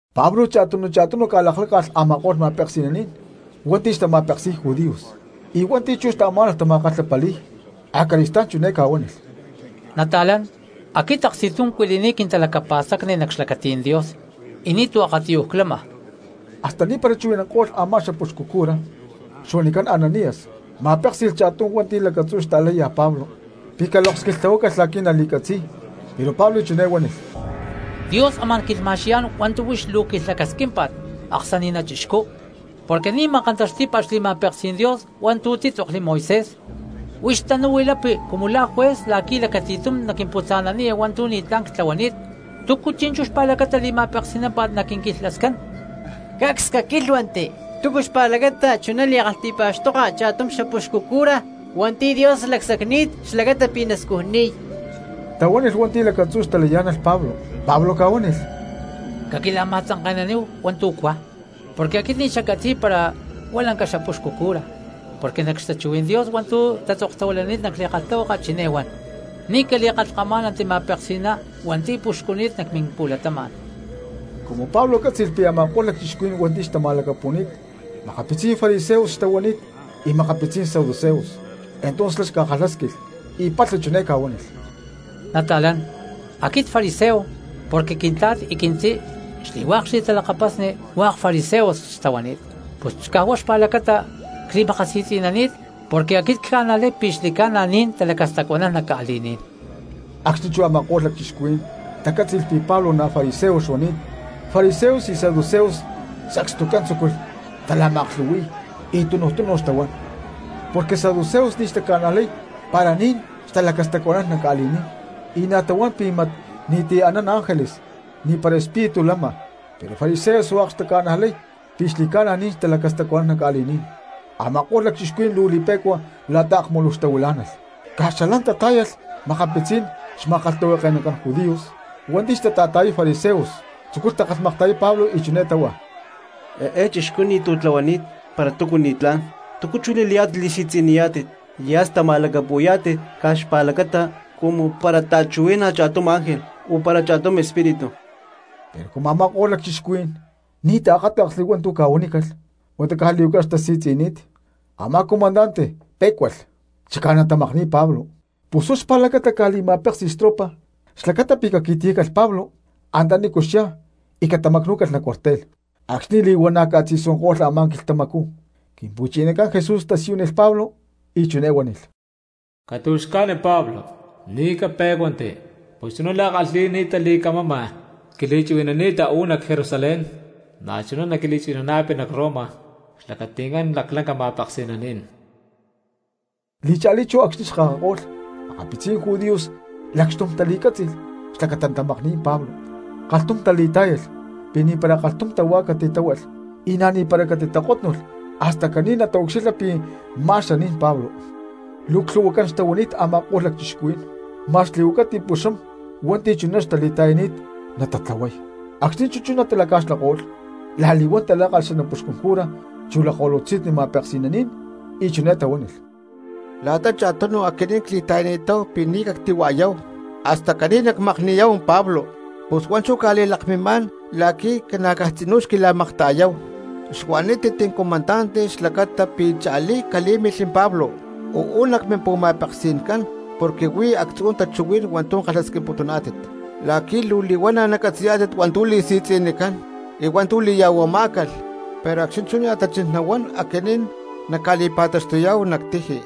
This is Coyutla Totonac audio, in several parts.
Pablo cha̠tunu cha̠tunu ca̠lakláca̠lh a̠ma̠ko̠lh makma̠peksi̠naní̠n hua̠nti̠ xtama̠peksi̠y judíos, y hua̠nti̠ chú xtaamá̠nalh tama̠kalhapali̠y, acali̠stá̠n chiné ca̠huánilh: —Nata̠lán, aquit aksti̠tum cuili̠ni̠t quintalacapa̠stacni nac xlacatí̠n Dios y ni̠tu̠ akatiyuj clama. Hasta ni̠para chuhui̠nanko̠lh a̠má xapuxcu cura xuanicán Ananías ma̠péksi̠lh cha̠tum hua̠nti̠ lacatzú xlakaláya Pablo pi̠ caloks quilhtláhualh la̠qui̠ nali̠catzi̠y. Pero Pablo chiné huánilh: —Dios amá̠n quilhma̠xqui̠yá̠n hua̠ntu̠ huix luu quilhlacasquímpa̠t, aksani̠na chixcú, porque ni̠ ma̠kantaxtí̠pa̠t xli̠ma̠peksí̠n Dios hua̠ntu̠ títzokli Moisés. Huix tanú huilapi cumu la̠ juez la̠qui̠ lacati̠tum naquimputza̠naniya hua̠ntu̠ ni̠tlá̠n ctlahuani̠t, ¿túcu chi̠nchú xpa̠lacata li̠ma̠peksi̠námpa̠t naquinquilhlascán? —¡Cacs caquílhuanti! ¿Túcu xpa̠lacata chuná li̠kalhti̠pa̠xtoka cha̠tum xapuxcu cura hua̠nti̠ Dios lacsacni̠t xlacata pi̠ nascujnaniy? —tahuánilh hua̠nti̠ lacatzú xtalakayá̠nalh Pablo. Pablo ca̠huánilh: —Caquila̠ma̠tzanke̠naníhu hua̠ntu̠ cuá, porque aquit ni̠ xaccatzi̠y para huá lanca xapuxcu cura. Porque nac xtachuhuí̠n Dios hua̠ntu̠ tatzoktahuilani̠t nac li̠kalhtahuaka chiné huan: “Ni̠ cali̠kalhkamá̠nanti ma̠peksi̠ná hua̠nti̠ puxcuni̠t nac mimpu̠latama̠n.” Cumu Pablo cátzi̠lh pi̠ a̠ma̠ko̠lh lacchixcuhuí̠n hua̠nti̠ xtatamacxtumi̠ni̠t makapitzí̠n fariseos xtahuani̠t y makapitzí̠n saduceos, entonces xlá ca̠xakátli̠lh y palha chiné ca̠huánilh: —Nata̠lán, aquit fariseo porque quintla̠t y quintzí xli̠hua̠k xli̠talakapasnicán hua̠k fariseos xtahuani̠t, pus caj huá xpa̠lacata cli̠makasi̠tzi̠nani̠t porque aquit cca̠najlay pi̠ xli̠ca̠na ni̠n talacastacuanán nac ca̠li̠ní̠n. Acxni̠ chú a̠ma̠ko̠lh lacchixcuhuí̠n tacátzi̠lh pi̠ Pablo na̠ fariseo xuani̠t, fariseos y saduceos sacstucán tzúculh tala̠ma̠aklhu̠hui̠y y tunuj tunu xtahuán. Porque saduceos ni̠ taca̠najlay para ni̠n talacastacuanán nac ca̠li̠ní̠n, y na̠ tahuán pi̠ mat ni̠ti̠ anán ángeles y ni̠para huá espíritu lama. Pero Fariseos hua̠k taca̠najlay pi̠ xli̠ca̠na ni̠n talacastacuanán nac ca̠li̠ní̠n. Ama̠ko̠lh lacchixcuhuí̠n luu li̠pe̠cua la̠ta akmuluj xtahuilá̠nalh, caj xalán tatá̠yalh makapitzí̠n xma̠kalhtahuake̠nacán judíos hua̠nti̠ xtata̠ta̠yay fariseos, tzúculh takalhmakta̠yay Pablo y chiné táhua: —Eé chixcú ni̠tu̠ tlahuanít para túcu ni̠tlá̠n. ¿Túcu chú li̠layá̠tit li̠si̠tzi̠niyá̠tit y hasta ma̠lacapu̠yá̠tit caj xpa̠lacata cumu para ta̠chuhuí̠nalh cha̠tum ángel o para cha̠tum espíritu? Pero cumu a̠ma̠ko̠lh lacchixcuhuí̠n ni̠ taakáta̠ksli hua̠ntu̠ ca̠huanícalh huata caj li̠huaca xtasi̠tzi̠ni̠t, a̠má comandante pé̠cualh chicá natamakni̠y Pablo, pus huá xpa̠lacata ca̠li̠ma̠péksi̠lh xtropa xlacata pi̠ caqui̠tiyácalh Pablo antanícu xyá y catamacnú̠calh nac cuartel. Acxni̠ li̠huana̠ ca̠tzi̠suanko̠lh a̠má quilhtamacú Quimpu̠chinacán Jesús tasiyúnilh Pablo y chiné huánilh: —Catu̠xca̠ni Pablo, ni̠ capé̠cuanti; pus chuná la̠ kalhi̠ni̠ta li̠camama quili̠chuhui̠nani̠ta uú nac Jerusalén na̠chuná naquili̠chuhui̠nana̠pi nac Roma cxlacati̠ncán laclanca ma̠peksi̠naní̠n. Li̠cha̠lí chú acxni̠ xkakako̠lh makapitzí̠n judíos lacxtum tali̠cátzi̠lh xlacata natamakni̠y Pablo, kalhtum tali̠tá̠yalh pi̠ ni̠para kalhtum tahuá catitáhualh y na̠ ni̠para catitakótnulh hasta caní nataucxilha pi̠ má xaní̠n Pablo. Luu clhu̠huacán xtahuani̠t a̠ma̠ko̠lh lacchixcuhuí̠n ma̠x li̠huacay ti̠puxam hua̠nti̠ chuná xtali̠ta̠yani̠t natatlahuay. Acxni̠ chú chuná talaca̠xlako̠lh la̠li̠huán talákalh xanapuxcún cura chu lakko̠lutzi̠nni ma̠peksi̠naní̠n, y chiné tahuánilh: —La̠ta cha̠tunu aquinín cli̠ta̠yani̠táhu pi̠ ni̠ cactihua̠yáhu hasta caní nacmakni̠yá̠hu Pablo. Pus huá chú cca̠li̠lakmimá̠n la̠qui̠ ca̠na̠caj tzinú xquila̠makta̠yáhu, xuanítit comandante xlacata pi̠ cha̠lí calí̠milh Pablo uú nac mimpu̠ma̠peksi̠ncán porque huí actzu̠ tachuhuí̠n hua̠ntu̠ kalhasquimputuná̠tit la̠qui̠ luu li̠huana̠ nacatzi̠yá̠tit hua̠ntu̠ li̠si̠tzi̠nicán y hua̠ntu̠ li̠ya̠huamá̠calh. Pero acxni̠ chú nia̠ tachín nahuán aquinín nacca̠li̠pa̠taxtuyá̠hu nac tiji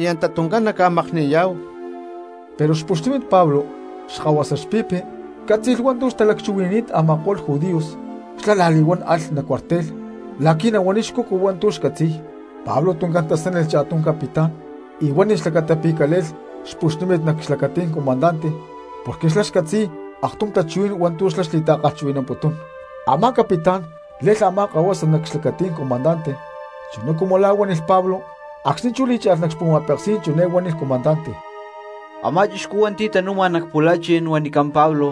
y anta tuncán nacmakni̠yá̠hu. Pero xpuxnímit Pablo, xkahuasa xpi̠pi cátzi̠lh hua̠ntu̠ xtalaclhca̠huili̠ni̠t a̠ma̠ko̠lh judíos, xlá la̠li̠huán alh nac cuartel la̠qui̠ nahuaniy xcucu hua̠ntu̠ xcatzi̠y. Pablo tuncán tasánilh cha̠tum capitán y huánilh xlacata pi̠ cale̠lh xpuxnímit nac xlacatí̠n comandante porque xlá xcatzi̠y aktum tachuhuí̠n hua̠ntu̠ xlá xli̠ta̠kalhchuhui̠namputún. Amá capitán le̠lh a̠má kahuasa nac xlacatí̠n comandante chuná cumu la̠ huánilh Pablo, acxni̠ chú lí̠cha̠lh nac xpu̠ma̠peksí̠n chiné huánilh comandante: —Amá chixcú hua̠nti̠ tanu̠ma nac pu̠la̠chi̠n huanicán Pablo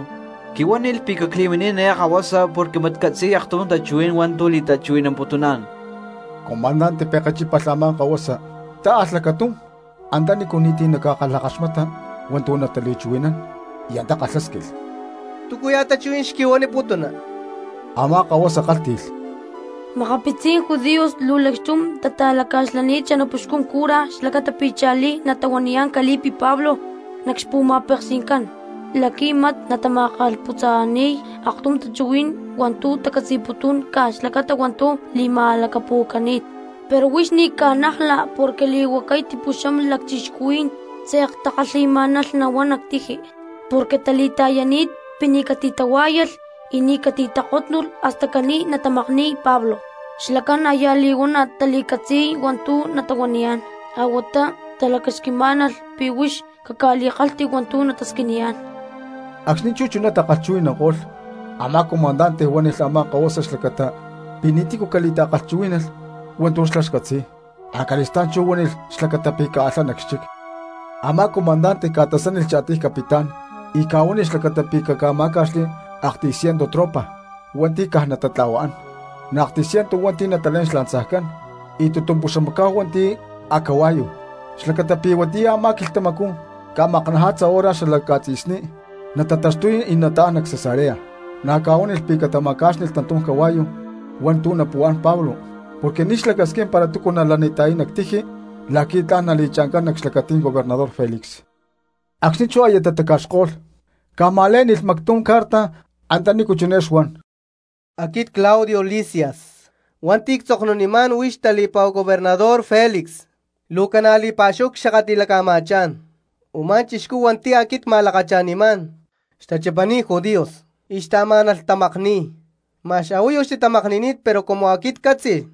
quihuánilh pi̠ cacli̠minín eé kahuasa porque mat catzi̠y aktum tachuhuí̠n hua̠ntu̠ li̠ta̠chuhui̠namputuná̠n. Comandante pekechípalh a̠má kahuasa, tá̠alh lacatum antanícu ni̠ti̠ naca̠kalhakaxmata hua̠ntu̠ natali̠chuhui̠nán y antá kalhásquilh: —¿Túcuya̠ tachuhuí̠n xquihuaniputuna? Amá kahuasa kálhti̠lh: —Makapitzí̠n judíos luu lacxtum tata̠laca̠xlani̠t xanapuxcún cura xlacata pi̠ cha̠lí natahuaniyá̠n cali̠pi Pablo nac xpu̠ma̠peksi̠ncán la̠qui̠ mat natama̠kalhputza̠ni̠y aktum tachuhuí̠n hua̠ntu̠ tacatzi̠putún caj xlacata hua̠ntu̠ li̠ma̠lacapu̠cani̠t. Pero huix ni̠ caca̠najla porque li̠huacay ti̠puxam lacchixcuhuí̠n tze̠k takalhi̠má̠nalh nahuán nac tiji porque tali̠ta̠yani̠t pi̠ ni̠ catitahuá̠yalh y ni̠ catitakótnulh hasta caní natamakni̠y Pablo. Xlacán aya li̠huana̠ tali̠catzi̠y hua̠ntu̠ natahuaniyá̠n a̠huatá talacasquimá̠nalh pi̠ huix caca̠li̠kalhti hua̠ntu̠ natasquiniyá̠n. Acxni̠ chú chuná takalhchuhui̠nanko̠lh, a̠má comandante huánilh a̠má kahuasa xlacata pi̠ ni̠tícu cali̠ta̠chuhuí̠nalh hua̠ntu̠ xlá xcatzi̠y, acali̠stá̠n chú huánilh xlacata pi̠ caalhá nac xchic. Amá comandante ca̠tasánilh cha̠tiy capitán y ca̠huánilh xlacata pi̠ catamá̠ca̠xli aktiy ciento tropa hua̠nti̠ caj natatla̠huaán, na̠ aktiy ciento hua̠nti̠ natalé̠n xlanzajcán, y tutumpuxamacá̠hu hua̠nti̠ a̠cahua̠yu, xlacata pi̠ huatiyá a̠má quilhtamacú ca̠maknaja̠tza hora xala ca̠tzi̠sní natataxtuy y nataán nac Cesarea. Na̠ ca̠huánilh pi̠ catama̠cá̠xnilh tantum cahua̠yu hua̠ntu̠ napu̠án Pablo porque ni̠ xlacasquín para túcu nalanita̠yay nac tiji la̠qui̠ tla̠n nali̠cha̠ncán nac xlacatí̠n gobernador Felix. Acxni̠ chú aya tataca̠xko̠lh, ca̠ma̠lé̠ni̠lh mactum carta antanícu chiné xuan: “Aquit Claudio Lisias hua̠nti̠ ctzoknunimá̠n huix tali̠pa̠hu gobernador Felix: luu ca̠na̠ li̠pa̠xúhu cxakatli̠laca̠ma̠chá̠n. Umá chixcú hua̠nti̠ aquit cma̠lakacha̠nimá̠n xtachipani̠t judíos y xtaamá̠nalh tamakni̠y, ma̠x a̠huayu xtitamakni̠ni̠t pero cumu aquit ccátzi̠lh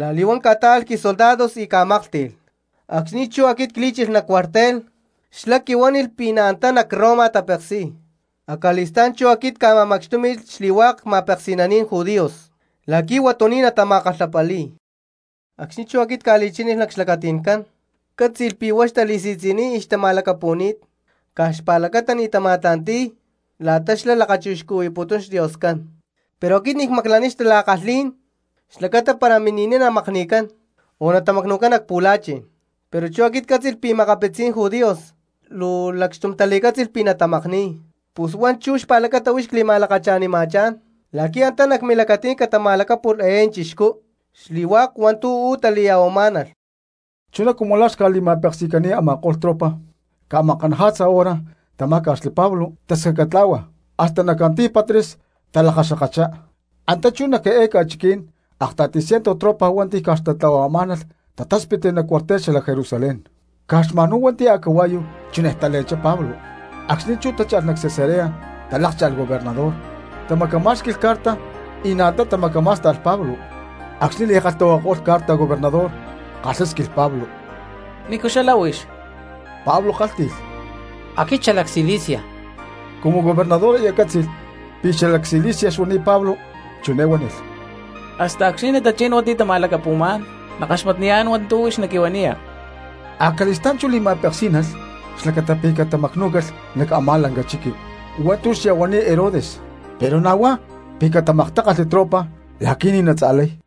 la̠li̠huán cca̠tá̠alh quisoldados y cca̠máklhti̠lh. Acxni̠ chú aquit clí̠chilh nac cuartel xlá quihuánilh pi̠ na̠ antá nac Roma tapeksi̠y. Acali̠stá̠n chú aquit cca̠ma̠macxtúmi̠lh xli̠hua̠k ma̠peksi̠naní̠n judíos la̠qui̠ huatuní̠n natama̠kalhapali̠y. Acxni̠ chú aquit cca̠li̠chá̠nilh nac xlacati̠ncán ccátzi̠lh pi̠ huá xtali̠si̠tzi̠niy y xtama̠lacapu̠ni̠t caj xpa̠lacata ni̠ tama̠tla̠nti̠y la̠ta xlá lakachixcuhui̠putún xDioscán, pero aquit ni̠ cmaclaniy xtala̠kalhí̠n xlacata para mini̠niy namakni̠cán o natamacnu̠cán nac pu̠la̠chi̠n. Pero chú aquit ccátzi̠lh pi̠ makapitzí̠n judíos luu lacxtum tali̠cátzi̠lh pi̠ natamakni̠y, pus huá chú xpa̠lacata huix cli̠ma̠lakacha̠nima̠chá̠n la̠qui̠ antá nac milacatí̠n catama̠lacápu̠lh eé chixcú xli̠hua̠k hua̠ntu̠ uú tali̠ya̠huamá̠nalh.” Chuná cumu la̠ xca̠li̠ma̠peksi̠cani̠t, a̠ma̠ko̠lh tropa ca̠maknaja̠tza hora tamá̠ca̠xli Pablo tascacatlá̠hua, hasta nac Antípatris talakaxkakachá. Antá chú nac eé ca̠chiquí̠n akta̠ti ciento tropa hua̠nti̠ caj xtatla̠huamá̠nalh, tatáspitli nac cuartel xalac Jerusalén, caj xma̠nhuá hua̠nti̠ a̠cahua̠yu chinej tale̠nchá Pablo. Acxni̠ chú tácha̠lh nac Cesarea talákcha̠lh gobernador, tamacamá̠xqui̠lh carta y na̠ antá tamacamá̠sta̠lh Pablo. Acxni̠ li̠kalhtahuakako̠lh carta gobernador kalhásquilh Pablo: —¿Nícu xalá huix? Pablo kálhti̠lh: —Aquit xalac Cilicia. Cumu gobernador aya cátzi̠lh pi̠ xalac Cilicia xuani̠t Pablo chiné huánilh: —Hasta acxni̠ natachín hua̠nti̠ tama̠lacapu̠má̠n nackaxmatniyá̠n hua̠ntu̠ huix naquihuaniya. Acali̠stá̠n chú li̠ma̠peksínalh xlacata pi̠ catamacnú̠calh nac a̠má lanca chiqui hua̠ntu̠ xya̠huani̠t Herodes, pero na̠ huá pi̠ catamaktákalhli tropa la̠qui̠ ni̠ natza̠lay.